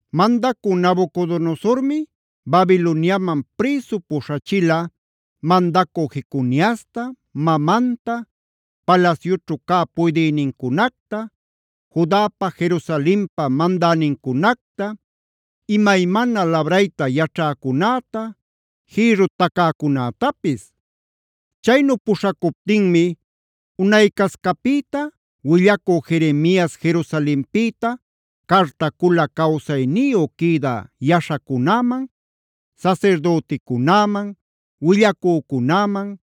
Mandacü Nabucodonosormi Babiloniaman prïsu puśhachila mandacü Jeconiasta, mamanta, palasyućhu cä puydïnincunacta, Judapa Jerusalenpa mandänincunacta, imaymana labrayta yaćhäcunäta, jïrru tacäcunätapis. Chaynu puśhacuptinmi unaycascapïta willacü Jeremias Jerusalenpïta cartacula cawsayniyu quïdä yaśhacunäman, sasirdüticunäman, willacücunäman,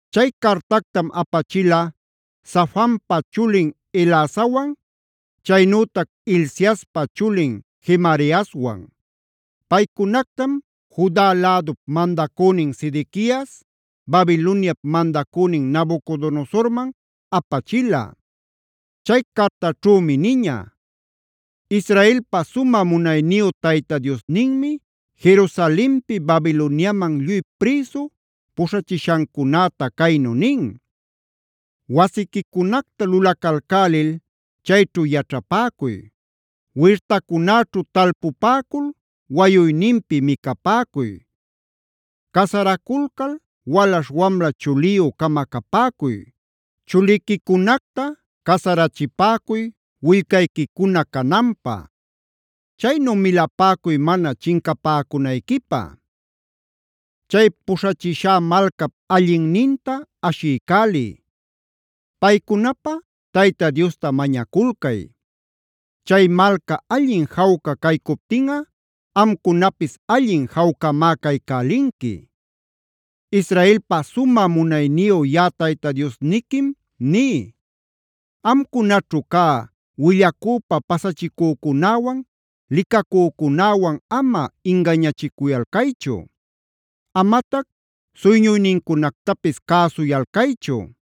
Chay cartactam apachila Safanpa chulin Elasawan, chaynütac Hilciaspa chulin Gemariaswan. Paycunactam Juda lädup mandacünin Sedequias Babiloniap mandacünin Nabucodonosorman apachila. Chay cartaćhümi niña: “Israelpa sumä munayniyu Tayta Diosninmi Jerusalenpi Babiloniaman lluy prïsu puśhachishancunäta caynu nin: ‘Wasiquicunacta lulacalcälil chayćhu yaćhapäcuy. Wirtacunäćhu talpupäcul wayuyninpi micapäcuy. Casaraculcal walaśh wamla chuliyü-cama capäcuy. Chuliquicunacta casarachipäcuy willcayquicuna cananpä. Chaynu milapäcuy mana chincapäcunayquipä. Chay puśhachishá malcap allinninta ashiycäliy. Paycunapä Tayta Diosta mañaculcay. Chay malca allin jawca caycuptinꞌa amcunapis allin jawcamá caycälinqui. Israelpa sumä munayniyu yaꞌa Tayta Diosniquim ní: Amcunaćhu cä willacüpa pasachicücunäwan, licacücunäwan ama ingañachicuyalcaychu. Amatac suyñuynincunactapis cäsuyalcaychu.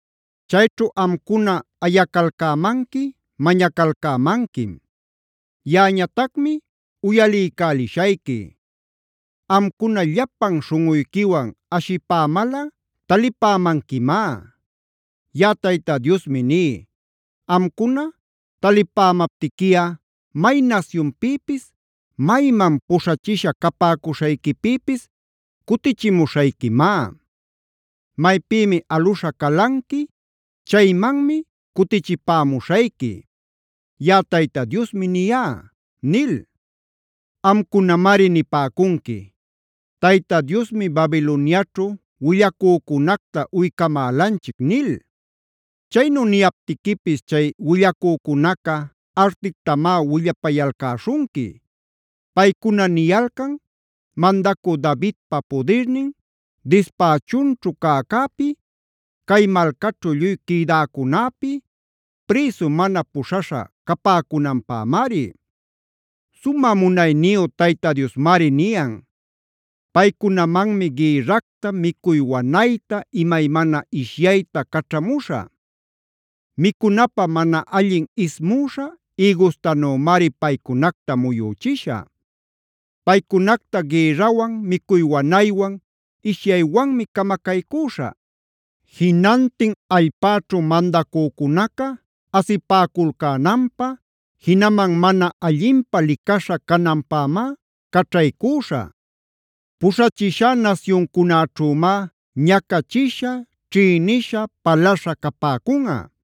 Chayćhu amcuna ayacalcämanqui mañacalcämanquim. Yaꞌañatacmi uyaliycälishayqui. Amcuna llapan śhunꞌuyquiwan ashipämalꞌa talipämanquimá.c Yaꞌa Tayta Diosmi ní: Amcuna talipämaptiquiꞌa may nasyunpïpis, mayman puśhachisha capäcuśhayquipïpis cutichimuśhayquimá. Maypïmi aluśha calanqui, chaymanmi cutichipämuśhayqui. Yaꞌa Tayta Diosmi niyá” nil. Amcunamari nipäcunqui: “Tayta Diosmi Babiloniaćhu willacücunacta uycamälanchic” nil. Chaynu niyaptiquipis chay willacücunaca artictamá willapayalcäśhunqui. Paycuna niyalcan mandacü Davidpa pudirnin dispächunćhu cäcäpi, cay malcaćhu lluy quïdäcunäpi, prïsu mana puśhaśha capäcunanpämari. Sumä munayniyu Tayta Diosmari niyan: “Paycunamanmi gïrracta, micuy wanayta, imaymana ishyayta caćhamuśhä. Micunapä mana allin ismüśha ïgustanümari paycunacta muyüchishä. Paycunacta gïrrawan, micuy wanaywan, ishyaywanmi camacaycüśhä. Jinantin allpäćhu mandacücunaca asipäculcänanpä, jinaman mana allinpä licaśha cananpämá caćhaycüśhä. Puśhachishá nasyuncunäćhümá ñacachisha, ćhïnisha, palaśha capäcunꞌa.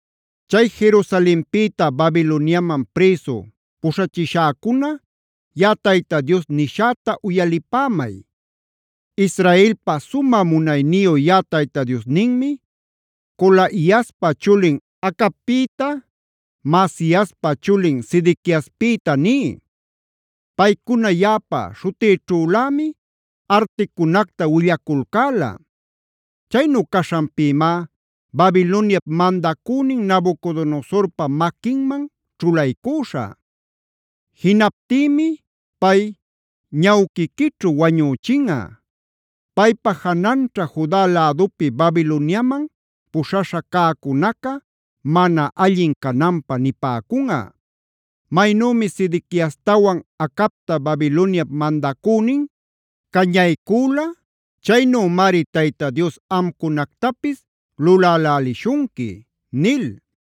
Chay Jerusalenpïta Babiloniaman prïsu puśhachishäcuna, yaꞌa Tayta Dios nishäta uyalipämay. Israelpa sumä munayniyu yaꞌa Tayta Diosninmi Colaiaspa chulin Acabpïta, Maasiaspa chulin Sedequiaspïta ní: Paycuna yaꞌapa śhutïćhülämi articunacta willaculcäla. Chaynu caśhanpïmá Babiloniap mandacünin Nabucodonosorpa maquinman ćhulaycüśhä. Jinaptïmi pay ñawquiquićhu wañüchinꞌa. Paypa jananćha Juda lädupi Babiloniaman puśhaśha cäcunaca mana allin cananpä nipäcunꞌa: ‘Maynümi Sedequiastawan Acabta Babiloniap mandacünin cañaycüla, chaynümari Tayta Dios amcunactapis lulälälishunqui’ nil.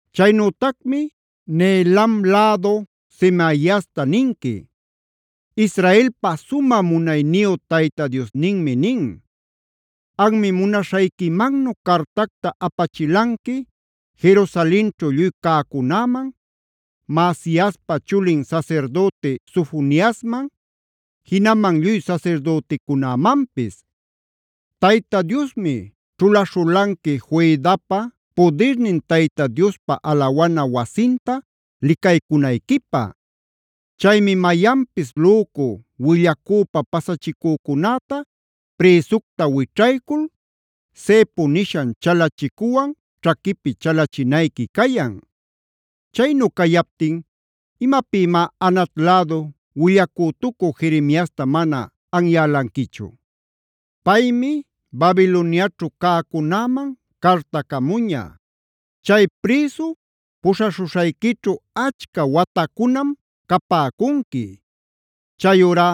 Chaynütacmi Nehelam lädu Semaiasta ninqui: “Israelpa sumä munayniyu Tayta Diosninmi nin: Anmi munaśhayquimannu cartacta apachilanqui Jerusalenćhu lluy cäcunäman, Maasiaspa chulin sasirdüti Sofoniasman, jinaman lluy sasirdüticunämanpis: ‘Tayta Diosmi ćhulaśhulanqui Joiadapa pudirnin Tayta Diospa alawana wasinta licaycunayquipä. Chaymi mayanpis lücu willacüpa pasachicücunäta prïsucta wićhaycul, cepo nishan chalachicuwan ćhaquipi chalachinayqui cayan. Chaynu cayaptin ¿imapïmá Anat lädu willacütucü Jeremiasta mana anyälanquichu? Paymi Babiloniaćhu cäcunäman cartacamuña: “Chay prïsu puśhaśhuśhayquićhu achca watacunam capäcunqui. Chayurá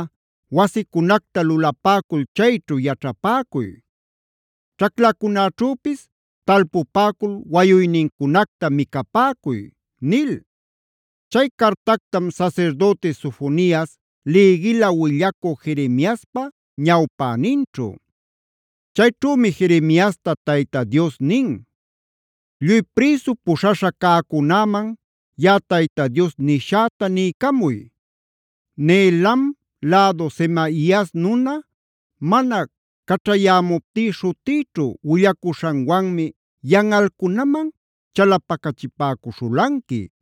wasicunacta lulapäcul chayćhu yaćhapäcuy. Ćhaclacunaćhüpis talpupäcul wayuynincunacta micapäcuy”’” nil. Chay cartactam sasirdüti Sofonias lïgila willacü Jeremiaspa ñawpäninćhu. Chayćhümi Jeremiasta Tayta Dios nin: “Lluy prïsu puśhaśha cäcunäman yaꞌa Tayta Dios nishäta niycamuy: Nehelam lädu Semaias nuna, mana caćhayämuptí śhutïćhu willacuśhanwanmi yanꞌalcunaman chalapacachipäcuśhulanqui.